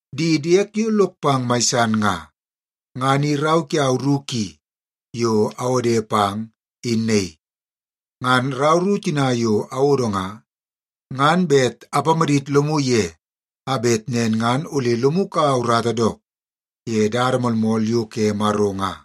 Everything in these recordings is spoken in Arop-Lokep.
Di diek yo lok pang mai san nga, ngan i rau kiau ru ki yo awode pang in naii. Ngan rau ru tina yo awodo nga, ngan bet apamadit lomu ye a bet nen ngan ole lomu kaua urata dook ye dada moolmool yo ke Maro nga.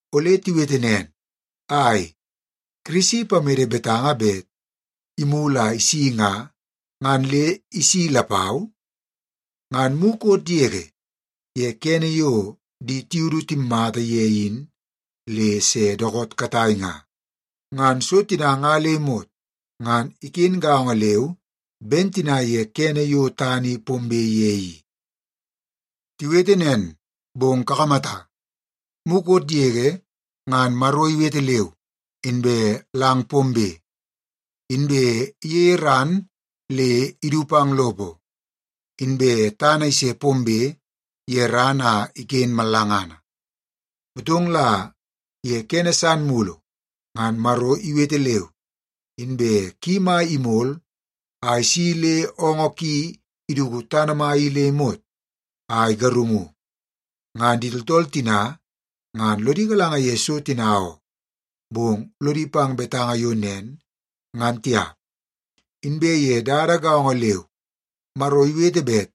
Ole tiwete nen, “Ai, Kirisi ipamede betanga bet imulu a isi nga, ngan le isi lapau? Ngan mukot yege ye kene yo di tiudu timmata ye in le se dookoot katai nga, ngan so tina nga le imot ngan iken gaongo leu ben tina ye kene yo tana i pombe ye i.” Tiwete nen, bong kakamata, mukot yege ngan Maro iwete leu, inbe lang pombe. Inbe iyeie ran le idu pang lopo, inbe tana ise pombe ye ran a iken mallangana. Motong la ye kene san mulu ngan Maro iwete leu, inbe ki mai imol a isi le oongoo ki iduku tana mai i le imot a igarungu. Ngan di tooltool tina ngan lodi galanga ye so tina oo, bong lodi pang betanga yo nen ngan tiap. Inbe ye dada gaongo leu, Maro iwete bet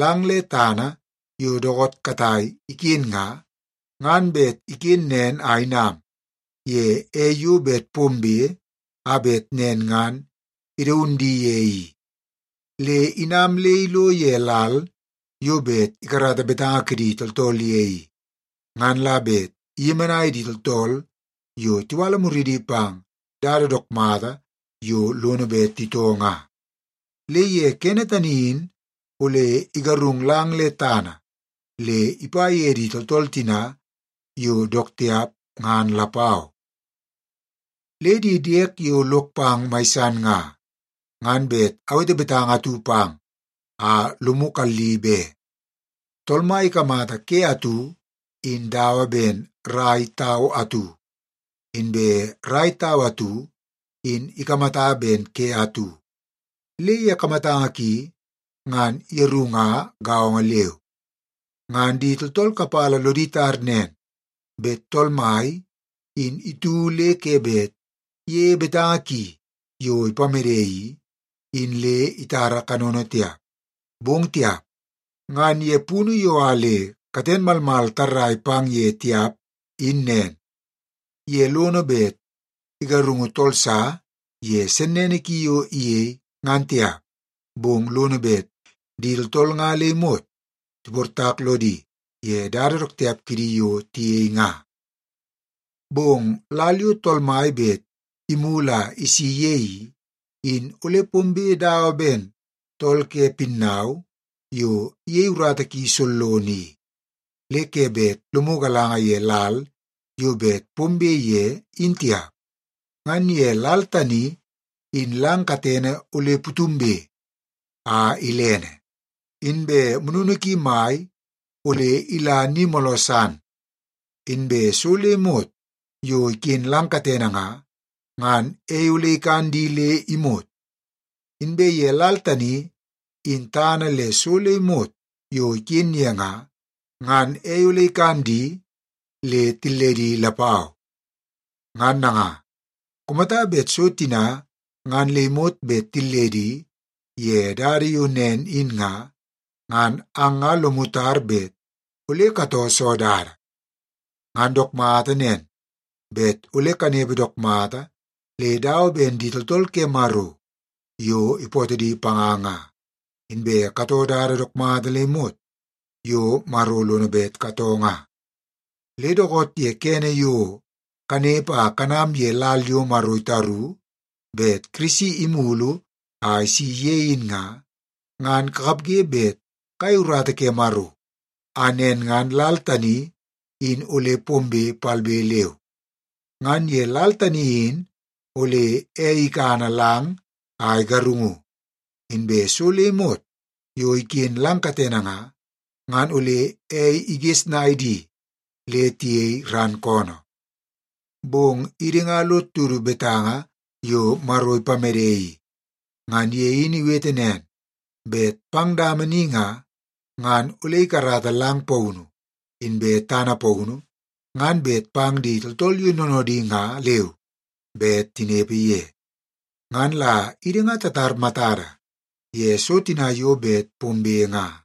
lang le tana yo dookoot katai iken nga, ngan bet iken nen a inam ye ei yo bet pombe a bet nen ngan idaun di ye i. Le inam le ilo ye lal yo bet ikarata betanga kidi tooltool ye i, ngan la bet iyemenai di tooltool yo tiwala muridi pang dada dook mata yo lono bet titoo nga. Le ye kene tani in ole igarung lang le tana le ipa ye di tooltool tina yo dook tiap ngan lapau. Le di diek yo lok pang mai san nga, ngan bet awete betanga atu pang a lomu kalli be. Tool Mai ikamata ke atu in dawa ben rai tau atu, inbe rai tau atu in ikamata ben ke atu. Le ye kamatanga ki ngan yeru nga gaongo leu. Ngan di tooltool kapala lodi tar nen bet Tool Mai in itu le ke bet iyeie betanga ki yo ipamede i, in le itara kanono tiap, bong tiap. Ngan ye punu yo a le katen malmal tarrai pang ye tiap in nen. Ye lono bet igarungu tool sa ye sennene ki yo iyei ngan tiap, bong lono bet di tooltool nga le imot tiportak lodi ye dada dook tiap kidi yo tiyei nga. Bong lal yo Tool Mai bet imulu a isi ye i, in ole pombe dawa ben tool ke pinnau yo iyei urata ki sollono i, le ke bet lomu galanga ye lal yo bet pombe ye in tiap. Ngan ye lal tani in lang katene ole putumbe a ilene, inbe mununu ki mai ole ila ni mooloo san. Inbe so le imot yo iken lang katene nga, ngan ei ole ikan di le imot. Inbe ye lal tani in tana le so le imot yo iken ye nga, ngan ei ole ikan di le tilledi lapau. Ngan nanga, kumata bet so tina ngan le imot bet tilledi ye dada yo nen in nga, ngan ang ngan lomu tar bet ole katoo soo dada? Ngan dook mata nen, bet ole kanepe dook mata le dawa ben di tooltool ke Maro yo ipootoo di panga nga, inbe katoo dada dook mata le imot yo Maro lono bet katoo nga. Le dookoot ye kene yo kanepe a kanam ye lal yo Maro itaru bet Kirisi imulu a isi ye in nga, ngan kakapge bet kayei urata ke Maro a nen ngan lal tani in ole pombe palbe leu. Ngan ye lal tani in ole ei ikana lang a igarungu, inbe so le imot yo iken lang katene nga, ngan ole ei igesnai di le tiyei ran koonoo. Bong idi nga lod tutu betanga yo Maro ipamede i. Ngan ye in iwete nen, bet pang dama ni nga, ngan ole ikarata lang paunu inbe tana paunu ngan bet pang di tooltool yo noonoodi nga leu bet tinepe ye. Ngan la idi nga tatar matada ye so tina yo bet pombe nga.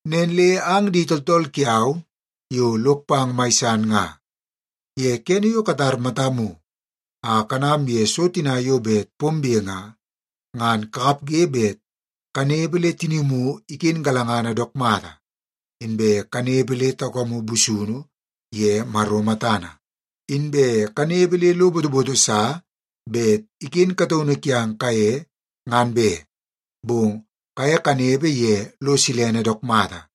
Nen le ang di tooltool kiau yo lok pang mai san nga, ye kene yo katar matamu a kanam ye so tina yo bet pombe nga, ngan kakapge bet kanepe le tinimu iken galangana dook mata, inbe kanepe le taukamu busunu ye Maro matana. Inbe kanepe le lo botoboto sa bet iken kataunu kiang kaye ngan be, bong kaye kanepe ye lo silene dook mata.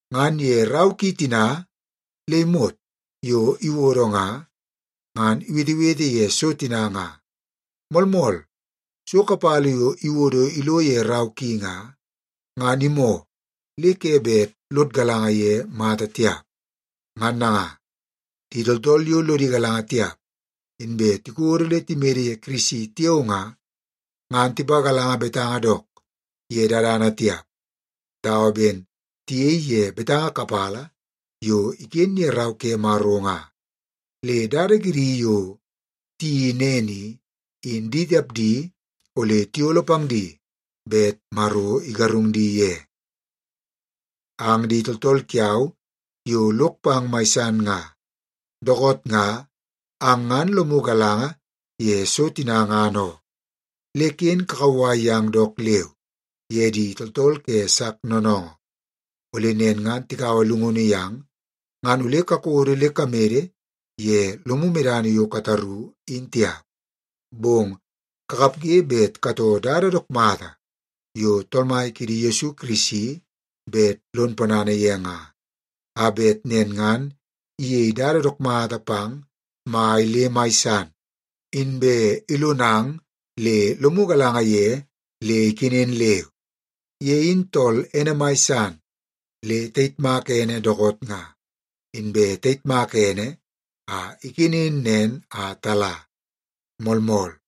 Ngan ye rau ki tina le imot yo iwodo nga, ngan iwetewete ye so tina nga. Moolmool, so kapala yo iwodo ilo ye rau ki nga, ngan imoo le ke bet lod galanga ye mata tiap. Ngan nanga, di tooltool yo lodi galanga tiap, inbe tikodo le timede ye Kirisi tiao nga, ngan tipagalanga betanga dook ye dadana tiap dawa ben tiyei ye betanga kapala yo iken ye Rau ke Maro nga. Le dada kidi yo tiyeii nen i, in di tapdi ole tiyolo pang di bet Maro igarung di ye. Ang di tooltool kiau yo lok pang mai san nga, dookoot nga ang ngan lomu galanga ye so tina ngan oo. Le ken kakauwai yang dook leu ye di tooltool ke sak noonoongoo. Ole nen ngan tikaua llungunu yang, ngan ole kakodo le kamede ye lomu medana yo kataru in tiap. Bong kakapge bet katoo dada dook mata yo Tool Mai kiidi Yesu Kirisi bet lon ponana ye nga, a bet nen ngan iyei dada dook mata pang mai le mai san, inbe ilonang le lomu galanga ye le ikenen leu. Ye in tool ene mai san le tayitmak ene dookoot nga, inbe tayitmaka ene a ikenen nen a tala. Moolmool.